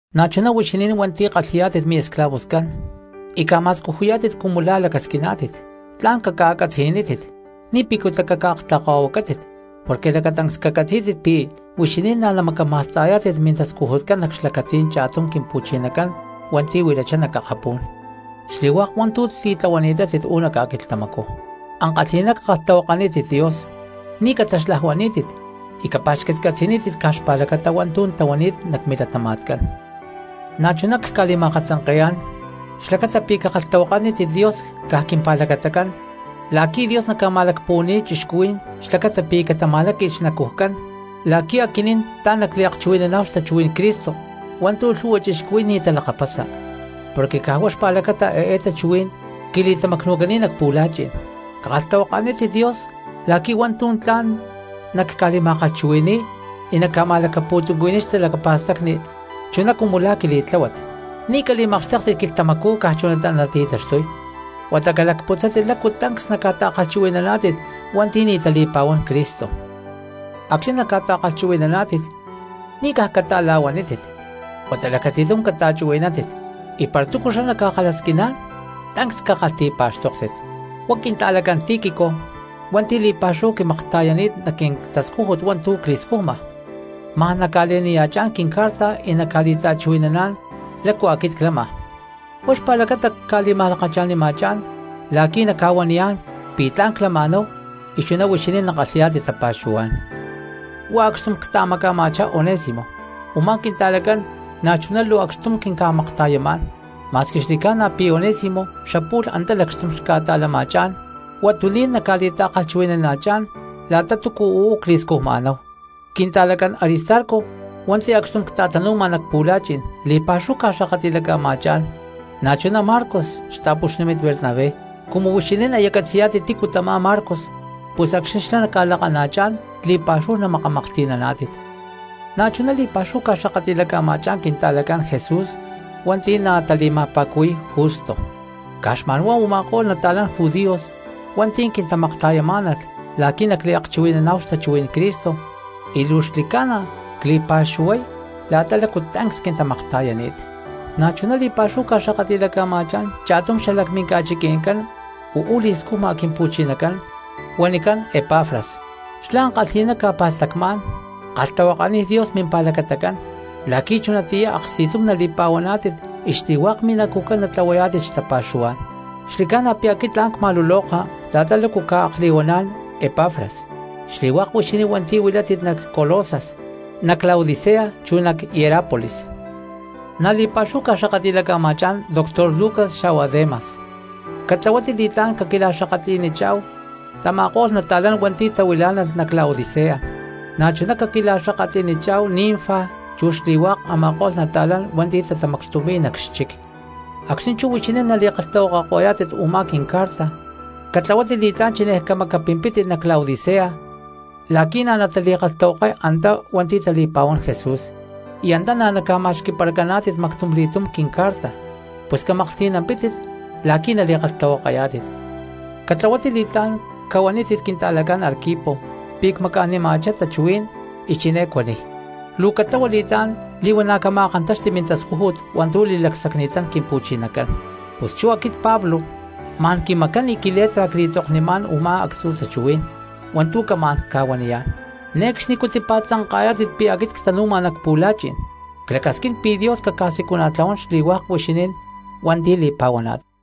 Na̠chuná huixinín hua̠nti̠ kalhi̠yá̠tit miesclavoscán y ca̠ma̠scujuyá̠tit cumu la̠ lacasquiná̠tit, tla̠n caca̠catzi̠nítit y ni̠ picutá caca̠aktlakahuacátit. Porque lacatancs cacatzí̠tit pi̠ huixinín na̠ namacama̠sta̠yá̠tit mintascujutcán nac xlacatí̠n cha̠tum Quimpu̠chinacán hua̠nti̠ huilachá nac akapú̠n, xli̠hua̠k hua̠ntu̠ titlahuani̠tátit uú nac ca̠quilhtamacú. Ankalhi̠ná cakalhtahuakanítit Dios ni̠ cataxlajuaní̠tit, y capa̠xcatcatzi̠nítit caj xpa̠lacata hua̠ntu̠ tlahuani̠t nac milatama̠tcán. Na̠chuná cca̠li̠ma̠katzanke̠yá̠n xlacata pi̠ cakalhtahuakanítit Dios caj quimpa̠lacatacán la̠qui̠ Dios naca̠ma̠lacpuhua̠ni̠y cristianos xlacata pi̠ catama̠láqui̠lh xnacujcán la̠qui̠ aquinín tla̠n nacliakchuhui̠naná̠hu xtachuhuí̠n Cristo hua̠ntu̠ lhu̠hua cristianos nia̠ talakapasa, porque caj huá xpa̠lacata eé tachuhuí̠n quili̠tamacnu̠cani̠t nac pu̠la̠chi̠n. Cakalhtahuakanítit Dios la̠qui̠ hua̠ntu̠ tla̠n nacca̠li̠ma̠kalhchuhui̠ni̠y y nacca̠ma̠lacapu̠tuncuhui̠niy xtalacapa̠stacni chuná cumu la̠ quili̠tláhuat. Ni̠ cali̠makxtéktit quilhtamacú caj chunatá nati̠taxtuy huata calacputzátit lácu tancs naca̠ta̠kalhchuhui̠naná̠tit hua̠nti̠ ni̠ tali̠pa̠huán Cristo. Acxni̠ naca̠ta̠kalhchuhui̠naná̠tit ni̠ caj cata̠la̠huanítit huata lacati̠tum cachuhui̠nántit; y para túcu xlá ca̠kalhasquiná̠n tancs cakalhti̠pa̠xtóktit. Huá quinta̠lacán Tíquico hua̠nti̠ li̠pa̠xúhu quimakta̠yani̠t nac quintascújut hua̠ntu̠ cli̠scujma, ma̠n naca̠le̠niya̠chá̠n quincarta y naca̠li̠ta̠chuhui̠naná̠n lácu aquit clama. Huá xpa̠lacata cca̠li̠ma̠lakacha̠nima̠chá̠n la̠qui̠ naca̠huaniyá̠n pi̠ tla̠n clama̠náhu y chuná huixinín nakalhi̠yá̠tit tapa̠xuhuá̠n. Huá acxtum cta̠maca̠ma̠chá Onésimo, u̠má quinta̠lacán na̠chuná luu acxtum quinca̠makta̠yamá̠n, ma̠squi xli̠ca̠na pi̠ huá Onésimo xapu̠lh antá lacxtum xca̠ta̠lama̠chá̠n; huatuní̠n naca̠li̠ta̠kalhchuhui̠nana̠chá̠n la̠ta túcu uú cli̠scujma̠náhu. Quinta̠lacán Aristarco hua̠nti̠ acxtum cta̠tanu̠ma nac pu̠la̠chi̠n li̠pa̠xúhu ca̠xakatli̠laca̠ma̠chá̠n, na̠chuná Marcos xta̠puxnímit Bernabé. Cumu huixinín aya catzi̠yá̠tit tícu tamá Marcos pus acxni̠ xlá naca̠lakana̠chá̠n li̠pa̠xúhu namakamaklhti̠naná̠tit. Na̠chuná li̠pa̠xúhu ca̠xakatli̠laca̠ma̠chá̠n quinta̠lacán Jesús hua̠nti̠ na̠ tali̠ma̠pa̠cuhui̠y Justo. Caj xma̠n huá u̠ma̠ko̠lh nata̠lán judíos hua̠nti̠ quintamakta̠yamá̠nalh la̠qui̠ nacliakchuhui̠naná̠hu xtachuhuí̠n Cristo, y luu xli̠ca̠na cli̠paxuhuay la̠ta lácu tancs quintamakta̠yani̠t. Na̠chuná li̠pa̠xúhu ca̠xakatli̠laca̠ma̠chá̠n cha̠tum xalac minca̠chiqui̠ncán uú li̠scujma Quimpu̠chinacán huanicán Epafras. Xlá ankalhi̠ná ca̠pa̠stacmá̠n kalhtahuakaniy Dios mimpa̠lacatacán la̠qui̠ chunatiyá aksti̠tum nali̠pa̠huaná̠tit y xli̠hua̠k minacujcán natlahuayá̠tit xtapa̠xuhuá̠n. Xli̠ca̠na pi̠ aquit tla̠n cma̠luloka la̠ta lácu ca̠akli̠huaná̠n Epafras xli̠hua̠k huixinín hua̠nti̠ huilátit nac Colosas, nac Laodicea, chu nac Hierápolis. Na̠ li̠pa̠xúhu ca̠xakatli̠laca̠ma̠chá̠n doctor Lucas xa̠hua Demas. Catlahuátit li̠tlá̠n caquila̠xakatli̠nichá̠hu tama̠ko̠lh nata̠lán hua̠nti̠ tahuilá̠nalh nac Laodicea. Na̠chuná caquila̠xakatli̠nichá̠hu Ninfa chu xli̠hua̠k a̠ma̠ko̠lh nata̠lán hua̠nti̠ tatamacxtumi̠y nac xchic. Acxni̠ chú huixinín nali̠kalhtahuakako̠yá̠tit u̠má quincarta, catlahuátit li̠tlá̠n chinej camacapimpítit nac Laodicea la̠qui̠ na̠ natali̠kalhtahuakay antá hua̠nti̠ tali̠pa̠huán Jesús. Y antá na̠ naca̠ma̠xqui̠paracaná̠tit mactumli̠túm quincarta, pus camaklhti̠nampítit la̠qui̠ nali̠kalhtahuakayá̠tit. Catlahuátit li̠tlá̠n cahuanítit quinta̠lacán Arquipo pi̠ cmaca̠nima̠chá tachuhuí̠n y chiné cuaniy: “Luu catlahua li̠tlá̠n li̠huana̠ cama̠kántaxti mintascújut hua̠ntu̠ li̠lacsacni̠tán Quimpu̠chinacán.” Pus chú aquit Pablo ma̠n quimacán y quiletra cca̠li̠tzoknimá̠n u̠má actzu̠ tachuhuí̠n hua̠ntu̠ camá̠n ca̠huaniyá̠n. ¡Ne̠cxnicú tipa̠tzanka̠yá̠tit pi̠ aquit ctanu̠ma nac pu̠la̠chi̠n! Clacasquín pi̠ Dios caca̠siculana̠tlahuán xli̠hua̠k huixinín hua̠nti̠ li̠pa̠huaná̠tit.